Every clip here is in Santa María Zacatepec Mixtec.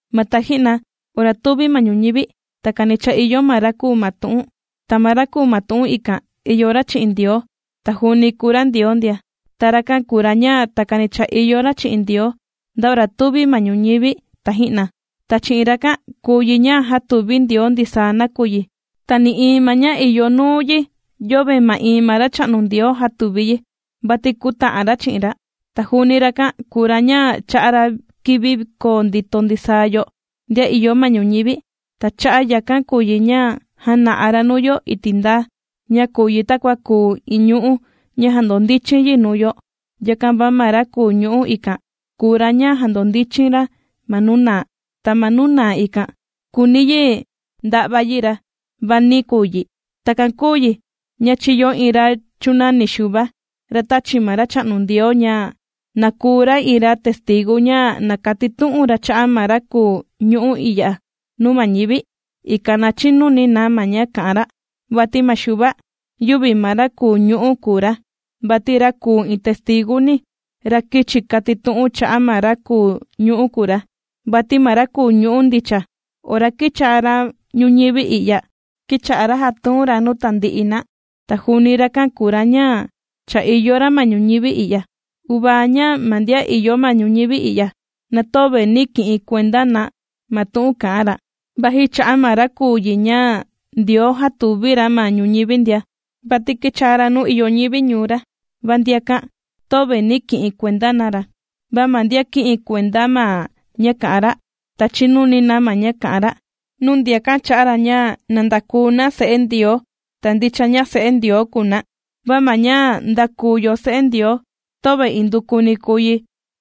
Ma taji'na ora tūvi ma ñuñivi, takani cha ìyo ma ra kùu ma tu'un. Ta ma ra kùu ma tu'un ikan ìyo ra chi'in Ndioo, ta juuni kùu ra Ndioo ndia. Ta rakan kùu ra ña takani cha ìyo ra chi'in Ndioo nda ora tūvi ma ñuñivi taji'na. Ta chi'in rakan kùu yi ña jātuvi Ndioo ndisaa nakuyi, ti nï'iin ma ña ìyo nuu yi yöve ma'iin ma Racha'nu Ndioo jātuvi yi, vati kūta'an ra chi'in ra. Ta juuni rakan kùu ra ña chà'a ra kivi koo ndito ndisaa yo ndian ìyo ma ñuñivi. Ta cha'a' yakan kùu yi ña jàna'a ra nuu yo iti' ndaa ña kùu yi takua kùu iin ñu'ú ña jàndondichin yi nuu yo. Yakan va ma ra kùu ñu'ú ikan kùu ra ña jàndondichin ra ma nuu naa. Ta ma nuu naa ikan kūuni yi nda'va yi ra, va nī kuu yi. Takan kūu yi ña chīyo iin ra chūnani Xuva, ra tāchi ma Racha'nu Ndioo ña, na kùu ra iin ra testigu ña na katitu'un ra cha'a' ma ra kùu ñu'ú i'ya nuu ma ñivi, ikan na chinuni na ma ña kà'an ra. Vati ma Xuva, yüvi ma ra kùu ñu'ú kùu ra, vati ra kùu iin testiguni, ra kīchi katitu'un cha'a' ma ra kùu ñu'ú kùu ra. Vati ma ra kùu ñu'ú ndicha, ora kīchaa ra ñuñivi i'ya, kīcha'a ra jàtuun ra nuu tandi'i na. Ta juuni rakan kùu ra ña cha ìyo ra ma ñuñivi i'ya. Uvaa ña ma ndian ìyo ma ñuñivi i'ya, na töve nī ki'in kuenda na ma tu'un kà'an ra, vaji cha'a' maa ra kùu yi ña Ndioo jātuvi ra ma ñuñivi ndia. Vati kīchaa ra nuu ìyo ñivi ñuu ra, va ndiakan töve nī ki'in kuenda na ra. Va ma ndian kī'in kuenda ma ña kà'an ra, ta chīnuni na ma ña kà'an ra, nuu ndiakan chā'a ra ña na ndakuu na se'e Ndioo. Ta ndicha ña se'e Ndioo kùu na, va ma ña ndākuu yo se'e Ndioo töve indukuni kùu yi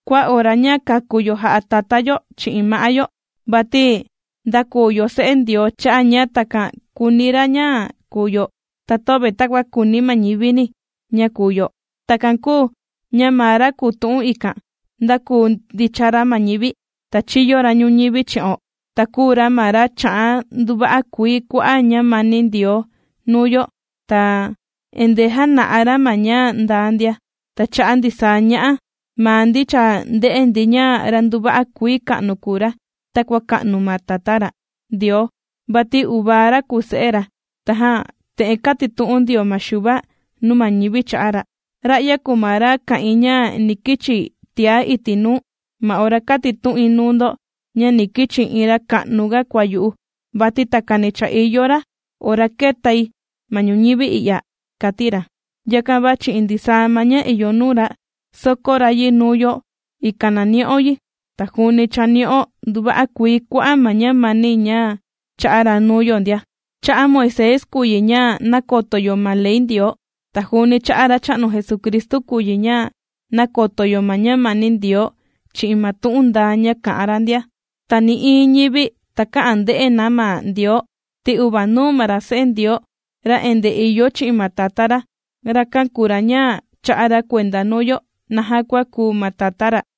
kua ora ña kāku yo jà'a tatá yo chi'in ma'á yo. Vati ndākuu yo se'e Ndioo cha'a' ña takan kùuni ra ña kùu yo, ta töve takua kùuni ma ñivini ña kùu yo. Takan kūu ña ma ra kùu tu'un ikan, ndākuu ndicha ra ma ñivi. Ta chīyo ra ñuñivi chi'o, ta kùu ra ma ra chà'a nduva'a kuii kua'a' ñamani Ndioo nuu yo, ta endee jàna'a ra ma ña ndaa ndia. Ta cha'a' ndisaa ña'a maa ndi cha ndē'e ndi ña ra nduva'a kuii ka'nu kùu ra takua ka'nu ma Tatá ra, Ndioo, vati uvaa ra kùu Se'e ra. Tajan te'en kātitu'un ndio ma Xuva nuu ma ñivi cha'a' ra: ―Ra'ya kùu ma ra kā'in ña ni kichi tiá iti' nuu, ma ora kātitu'in nuu ndo ña ni kichi iin ra ka'nuga kua yu'u. Vati takani cha ìyo ra ora kētai ma ñuñivi i'ya ―kàti ra. Yakan va chi'in ndisaa ma ña ìyo nuu ra, sōkó ra yi nuu yo, ikan na ni'o yi. Ta juuni cha nī'o nduva'a kuii kua'a' ma ñamani ña chā'a ra nuu yo ndia. Cha'a' Moisés kùu yi ña nàkoto yo ma ley Ndioo, ta juuni cha'a' Racha'nu Jesucristu kùu yi ña nàkoto yo ma ñamani Ndioo chi'in ma tu'un ndaa ña kà'an ra ndia. Ta nï'iin ñivi takä'an nde'e na ma Ndioo, ti uvanuuni ma ra Se'e Ndioo, ra endee ìyo chi'in ma Tatá ra, rakan kùu ra ña chà'a ra kuenda nuu yo naja kua kùu ma Tatá ra.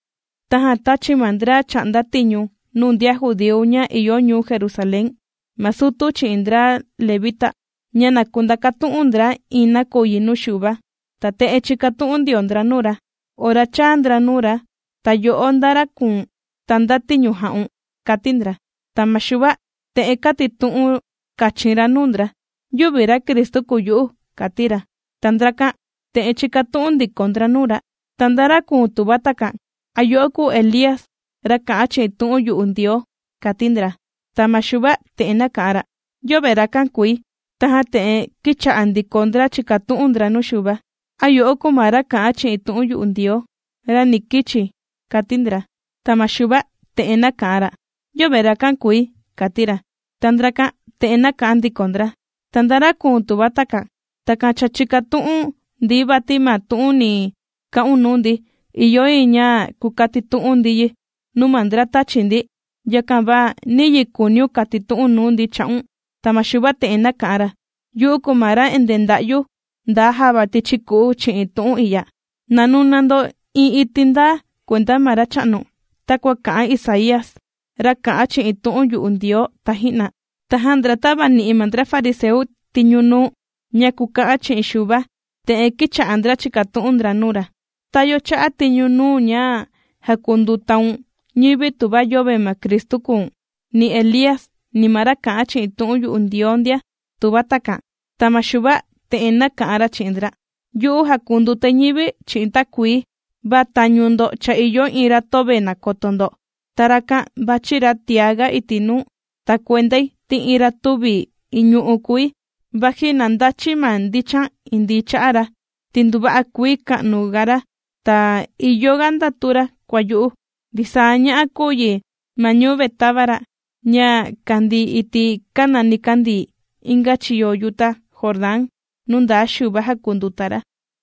Tajan tāchi ma ndra chà'nda tiñu nuu ndian judíu ña ìyo ñuu Jerusalén ma sutu chi'in ndra levita, ña na kundakatu'un ndra iin nakuyi nuu Xuva. Ta te'en chīkatu'un ndio ndra nuu ra, ora chāa ndra nuu ra: ―¿Ta yo'o nda ra kùu̱n, ta nda tiñu jà'un? ―kàti ndra. Ta ma Xuva te'en kātitu'un kachin ra nuu ndra: ―Yüvi ra Cristu kùu yu'u ―kàti ra. Ta ndrakan te'en chīkatu'un ndiko ndra nuu ra: ―¿Ta nda ra kùu̱n tuva takan? ¿A yo'o kùu Elía, ra kà'an chi'in tu'un yu'u Ndioo? ―kàti ndra. Ta ma Xuva te'en nāka'an ra: ―Yöve rakan kùi. Tajan te'en kīcha'a ndiko ndra chìkatu'un ndra nuu Xuva: ―¿A yo'o kùu ma ra kà'an chi'in tu'un yu'u Ndioo, ra ni kichi? ―kàti ndra. Ta ma Xuva te'en nāka'an ra: ―Yöve rakan kùi ―kàti ra. Ta ndrakan te'en nāka'an ndiko ndra: ―Ta, ¿nda ra kùu̱n tuva takan? Takan chìkatu'un ndi, vati ma tu'un ni ka'un nuu ndi ìyo yi ña kukatitu'un ndi yi nuu ma ndra tāchi ndi. Yakan va, ¿niyi kùuniun kàtitu'u̱n nuu ndi cha'un? Ta ma Xuva te'en nāka'an ra: ―Yu'u kùu ma ra endee ndà'yu nda java tichi ku'u chi'in tu'un i'ya: “Na nuna ndo iin iti' ndaa, kuenda ma Racha'nu”, takua kā'an Isaía, ra kā'an chi'in tu'un yu'u Ndioo taji'na. Tajan ndra tāvani'i ma ndra fariseu tiñu nuu, ña kuka'an chi'in Xuva, te'en kīcha'a ndra chìkatu'un ndra nuu ra: ―¿Ta yo chā'a tiñu nuu̱n ña jàkundutaun ñivi tuva yöve ma Cristu kùu̱n, ni Elía, ni ma ra kà'an chi'in tu'un yu'u Ndioo ndia?, tuva takan. Ta ma Xuva te'en nāka'an ra chi'in ndra: ―Yu'u jàkundutai ñivi chi'in takuii, va tañu ndo cha ìyo iin ra töve nàkoto ndo, ta rakan vàchi ra tiaga iti' nuu. Ta kuendai ti iin ra tüvi iñu'u kùi vaji na ndachi̱ ma ndichan indii cha'a ra, ti nduva'a kuii ka'nu ga ra ta ìyo ga ndatu ra kua yu'u ―kàti ra. Ndisaa ña'a kūu yi ma ñuu Betábara, ña kàndii iti' kàna nikandii inga chiyo yuta Jordán, nuu ndaa Xuva jàkunduta ra.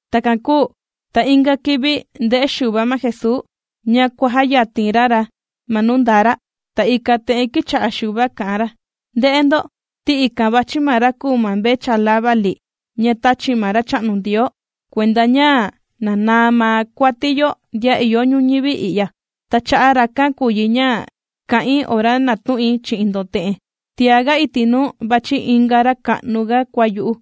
Takan kūu ta inga kivi ndē'e Xuva ma Jesuu, ña kuàjayatin ra ra ma nuu ndaa ra. Ta ikan te'en kīcha'a Xuva kà'an ra: ―¡Nde'e ndo, ti ikan vàchi ma ra kùu mvechala vali ña tāchi ma Racha'nu Ndioo kuenda ña na naa ma kuati yo ndian ìyo ñuñivi i'ya! Ta cha'a' rakan kùu yi ña kā'in ora nātu'in chi'in ndo te'en: “Tiaga iti' nuu vàchi inga ra ka'nu ga kua yu'u,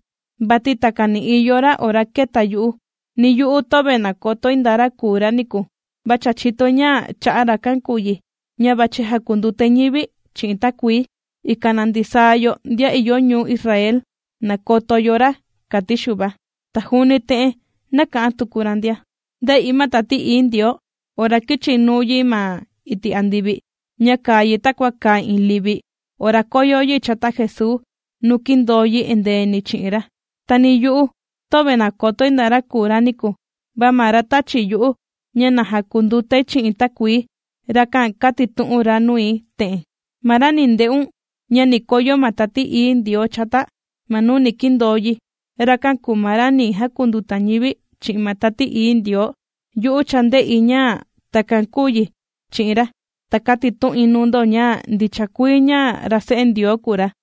vati takani ìyo ra ora kēta yu'u.” Ni yu'u töve nàkotoi nda ra kùu ra niku. Va cha chìtoi ña cha'a' rakan kùu yi ña vàchi jakundutai ñivi chi'in takuii, ikan na ndisaa yo ndian ìyo ñuu Israel nakoto yo ra ―kàti Xuva. Ta juuni te'en nāka'an tuku ra ndia: ―Ndē'i ma Tati Ií Ndioo ora kīchi nuu yi ma iti' andivi, ña kàa yi takua kàa iin livi ora kōyo yi chata Jesuu nuu kīndoo yi endeeni chi'in ra. Ta ni yu'u, töve nàkotoi nda ra kùu ra niku, va ma ra tāchi yu'u ña na jakundutai chi'in takuii, rakan kātitu'un ra nui te'en: “Ma ra ni nde'un ña ni koyo ma Tati Ií Ndioo chata ma nuu ni kindoo yi, rakan kùu ma ra ni jakunduta ñivi chi'in ma Tati Ií Ndioo.” Yu'u cha ndē'i ña takan kūu yi chi'in ra, ta kàtitu'in nuu ndo ña ndicha kuii ña ra Se'e Ndioo kùu ra.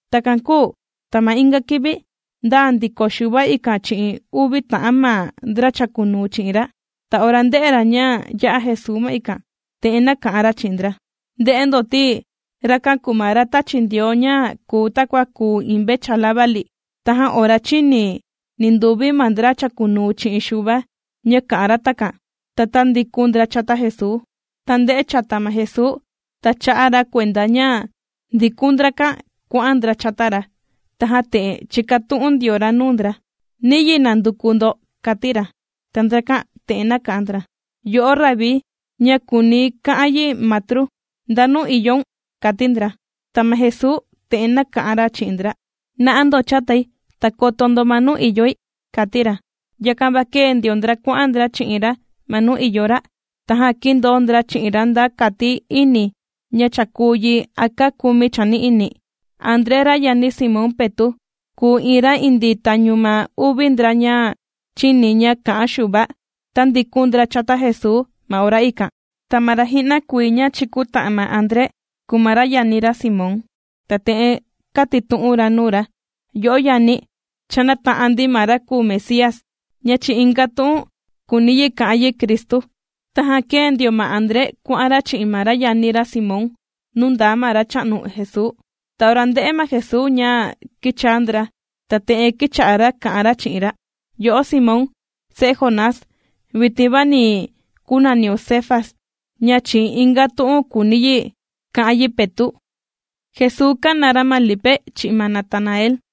Takan kūu ta ma inga kivi, ndaa ndiko Xuva ikan chi'in uvi ta'an ma ndra chàkunuu chi'in ra. Ta ora ndē'e ra ña yà'a Jesuu ma ikan, te'en nāka'an ra chi'in ndra: ―¡Nde'e ndo, ti rakan kùu ma ra tāchi Ndioo ña kùu takua kùu iin mvechala vali! Tajan ora chīni ninduvi ma ndra chàkunuu chi'in Xuva ña kā'an ra takan, ta tāndikun ndra chata Jesuu. Ta ndē'e chata ma Jesuu, ta chā'a ra kuenda ña ndikun ndrakan kuà'an ndra chata ra. Tajan te'en chīkatu'un ndio ra nuu ndra: ―¿Niyi nànduku ndo? ―kàti ra. Ta ndrakan te'en nāka'an ndra: ―Yo'o Rabí ―ña kùuni ka'an yi Matru― ¿ndanu ìyoun? ―kàti ndra. Ta ma Jesuu te'en nāka'an ra chi'in ndra: ―¡Na'a ndo chatai!, ta koto ndo ma nuu ìyoi ―kàti ra. Yakan va kēe ndio ndra kuà'an ndra chi'in ra ma nuu ìyo ra, tajan kīndoo ndra chi'in ra nda kati ini ña cha kùu yi a kaa kumi chani'ini. André ra yani Simón Petu', kùu iin ra indii tañu ma uvi ndra ña chīni ña kā'an Xuva, tàndikun ndra chata Jesuu ma ora ikan. Ta ma ra ji'na kuii ña chīkuta'an ma André kùu ma ra yani ra Simón. Ta te'en kātitu'un ra nuu ra: ―Yo'o yani, cha nāta'an ndi ma ra kùu Mesías (ña chi'in inga tu'un kùuni yi ka'an yi Cristu). Tajan kēe ndio ma André kuà'an ra chi'in ma yani ra Simón nuu ndaa ma Racha'nu Jesuu. Ta ora ndē'e ma Jesuu ña kīchaa ndra, ta te'en kīcha'a ra kà'an ra chi'in ra: ―Yo'o, Simón se'e Jonás, vitin va ni kunaniun Cefas ―ña chi'in inga tu'un kùuni yi ka'an yi Petu'. Jesuu kàna ra ma Lipe chi'in ma Natanael.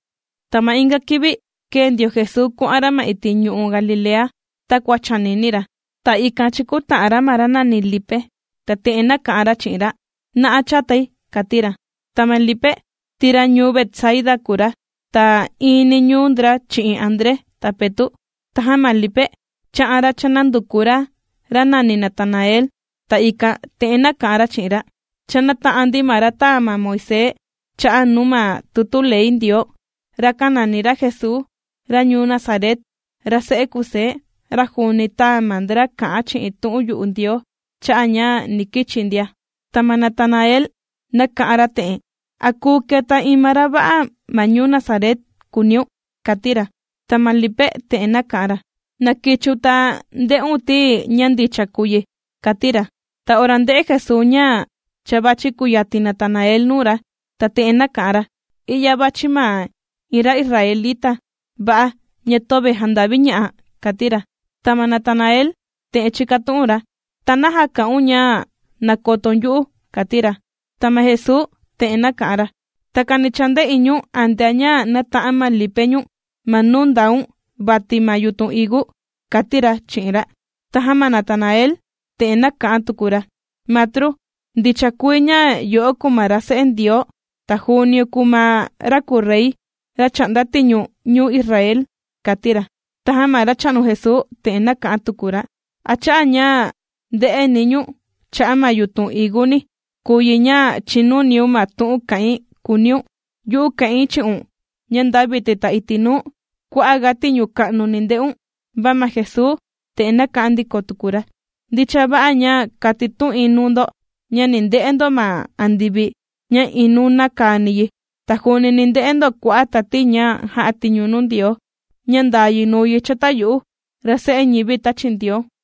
Ta ma inga kivi, kēe ndio Jesuu kuà'an ra ma iti' ñu'u' Galilea takua chànini ra. Ta ikan chīkuta'an ra ma ra nàni Lipe ta te'en nāka'an ra chi'in ra: ―¡Na'a chatai! ―kàti ra. Ta ma Lipe, ti ra ñuu Betsaida kùu ra, ta iini ñuu ndra chi'in André ta Petu'. Tajan ma Lipe chā'an ra chānanduku ra, ra nàni Natanael, ta ikan te'en nāka'an ra chi'in ra: ―Cha nāta'an ndi ma ra tāa ma Moisés cha'a' nuu ma tutu ley Ndioo. Rakan nàni ra Jesuu, ra ñuu Nazaret, ra se'e Kusé. Ra juuni tāa ma ndra kà'an chi'in tu'un yu'u Ndioo cha'a' ña ni kichi ndia. Ta ma Natanael nāka'an ra te'en: ―¿A kùu keta iin ma ra va'a ma ñuu Nazaret?, kùuniun ―kàti ra. Ta ma Lipe te'en nāka'an ra: ―Na kichiun ta nde'un ti ña ndicha kùu yi ―kàti ra. Ta ora ndē'e Jesuu ña cha vàchi kuyatin Natanael nuu ra, ta te'en nāka'an ra: ―¡I'ya vàchi ma iin ra israelita va'a, ña töve jànda'viña'a! ―kàti ra. Ta ma Natanael te'en chīkatu'un ra: ―¿Ta naja kà'un ña nàkotoun yu'u? ―kàti ra. Ta ma Jesuu te'en nāka'an ra: ―Takani cha ndē'i ñu̱n antea ña nàta'an ma Lipe ñu̱n ma nuu ndàun vati ma yutun higu ―kàti ra chi'in ra. Tajan ma Natanael te'en nāka'an tuku ra: ―Matru, ndicha kuii ña yo'o kùu ma ra Se'e Ndioo, ta juuniun kùu ma ra kùu Rey ra chà'nda tiñu ñuu Israel ―kàti ra. Tajan ma Racha'nu Jesuu te'en nāka'an tuku ra: ―¿A cha'a' ña ndē'eni̱ ñu̱n cha'a' ma yutun higuni kùu yi ña chìnuniun ma tu'un kà'in?, kùuniun. ¡Yu'u kà'in chi'un ña nda vitin ta iti' nuu, kua'a' ga tiñu ka'nu ni nde'un! Va ma Jesuu te'en nāka'an ndiko tuku ra: ―Ndicha va'a ña kàtitu'in nuu ndo ña ni nde'e ndo ma andivi ña iin nùna kani yi, ta juuni ni nde'e ndo kua'a' tati ña jà'a tiñu nuu Ndioo ña ndàa yi nùu yi chata yu'u, ra Se'e ñivi tāchi Ndioo.